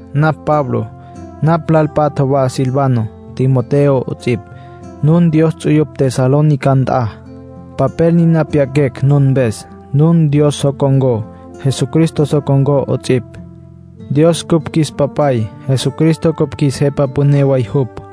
Napj Pablo. Napj lal patja wa Silvano, Timoteo 'ots'ipj. Nun Dios ts'uyupj Tesalónica nt'a. Papel niná pyaquecj nun mpes. Nun Dios so con̈có, Jesucristo so con̈có 'ots'ipj. Dios cupj qjuis Papay, Jesucristo cupj qjuis Jepa Püné way jupj.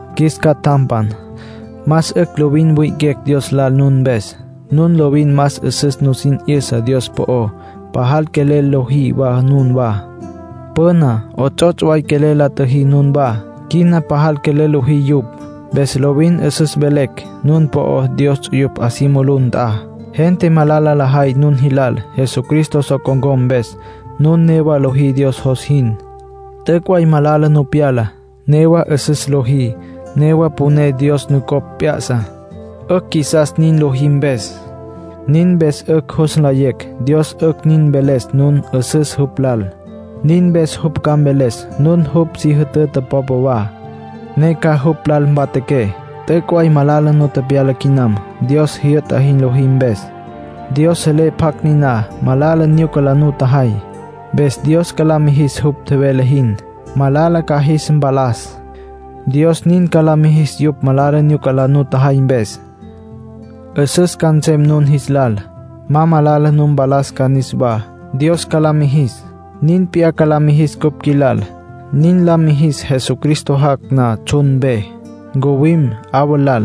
Qjuis catjampan, más 'ücj lovin wi'iquecj Dios lal nun mpes. Nun lovin más 'üsüs nusin 'yüsa Dios po'ó, pajal quelel lojí wa nunwá. Püna 'ots'ots' way quelel la tjüjí nunwá; quina pajal quelel lojí yupj. Mpes lovin 'üsüs velecj nun po'ó Dios ts'uyupj 'a si mulú nt'a. Gente malala lajay nun jilal Jesucristo so con̈có mpes, nun newa lojí Dios jos jin. T'üc' way malala nu pyala. Newa 'üsüs lojí, newa poné Dios nucopj p'ya'sa. 'Ücj qjuisas nin lojí mpes. Nin mpes 'ücj jus nlayecj Dios 'ücj nin mveles nun 'üsüs jupj lal. Nin mpes jupj ca mveles nun jupj si jütüta popa wa, ne ca jupj lal mpatjaqué. T'üc' way malala nu tepyala quinam Dios jyü'ta jin lojí mpes. Dios selé pjacj niná malala nyuca la nutjajay. Mpes Dios ca la mijis jupj tjevele jin. Malala ca jis mpalas; Dios nin ca la mijis yupj malala nyuca la nutjajay mpes. 'Üsüs ca nsem nun jis lal. Ma malala nu mpalas ca niswá, Dios ca la mijis. Nin p'iyá ca la mijis cupj qjuilal. Nin la mijis Jesucristo jac' na tsjun mpe. Ncuwim 'awa lal,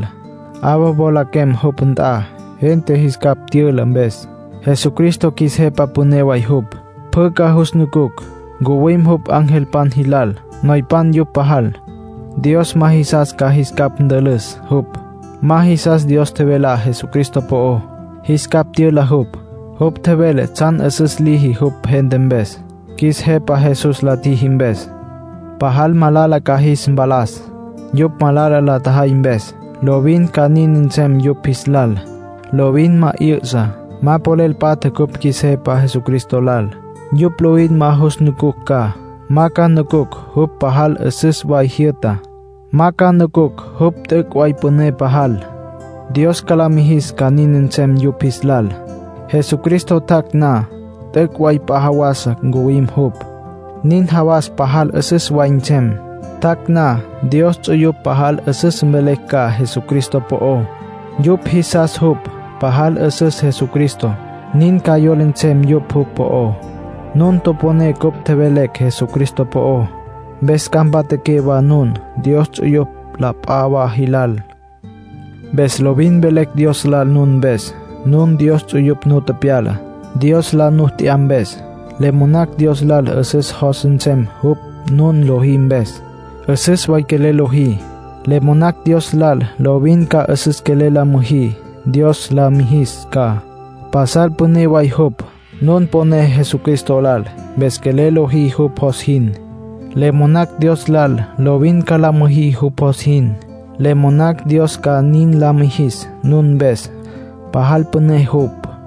'awa mwalaquem jupj nt'a, gente jis capj tyüla mpes. Jesucristo qjuis Jepa Püné way jupj. Pjü ca jus nucucj. Ncuwim jupj angelpan jilal; noypan yupj pajal. Dios ma jisas ca jis capj ntülüs jupj. Ma jisas Dios tjevelá Jesucristo po'ó, jis capj tyüla jupj. Jupj tjevele tsjan 'üsüs liji jupj gente mpes, qjuis Jepa Jesús la tjiji mpes. Pajal malala ca jis mpalas, yupj malala la tjajay mpes. Lovin ca nin nsem yupj jis lal, lovin ma 'yü'sa. Ma polel patja cupj qjuis Jepa Jesucristo lal. Yupj lovin ma jus nucucj ca. Ma ca nucucj jupj pajal 'üsüs way jyü'ta; ma ca nucucj jupj t'üc' way püné pajal. Dios ca la mijis ca nin nsem yupj jis lal, Jesucristo jac' na. T'üc' way p'a jawasa ncuwim jupj. Nin jawas pajal 'üsüs way nsem. Tjac' na, Dios ts'uyupj pajal 'üsüs mvelecj ca Jesucristo po'ó. Yupj jisastsja jupj. Pajal 'üsüs Jesucristo, nin ca yola nsem yupj jupj po'ó. Nun toponé cupj tjevelecj Jesucristo po'ó, mpes ca mpatjaqué wa nun Dios ts'uyupj la p'a wa jilal. Mpes lovin velecj Dios lal nun mpes. Nun Dios ts'uyupj nu tepyala, Dios la nu t'ya mpes. Le monacj Dios lal 'üsüs jos nsem jupj nun lojí mpes. 'Üsüs way quelel lojí. Le monacj Dios lal lovin ca 'üsüs quelel la müjí, Dios la mijis ca. Pasal püné way jupj. Nun poné Jesucristo lal, mpes quelel lojí jupj jos jin. Le monacj Dios lal lovin ca la müjí jupj jos jin. Le monacj Dios ca nin la mijis nun mpes. Pajal püné jupj.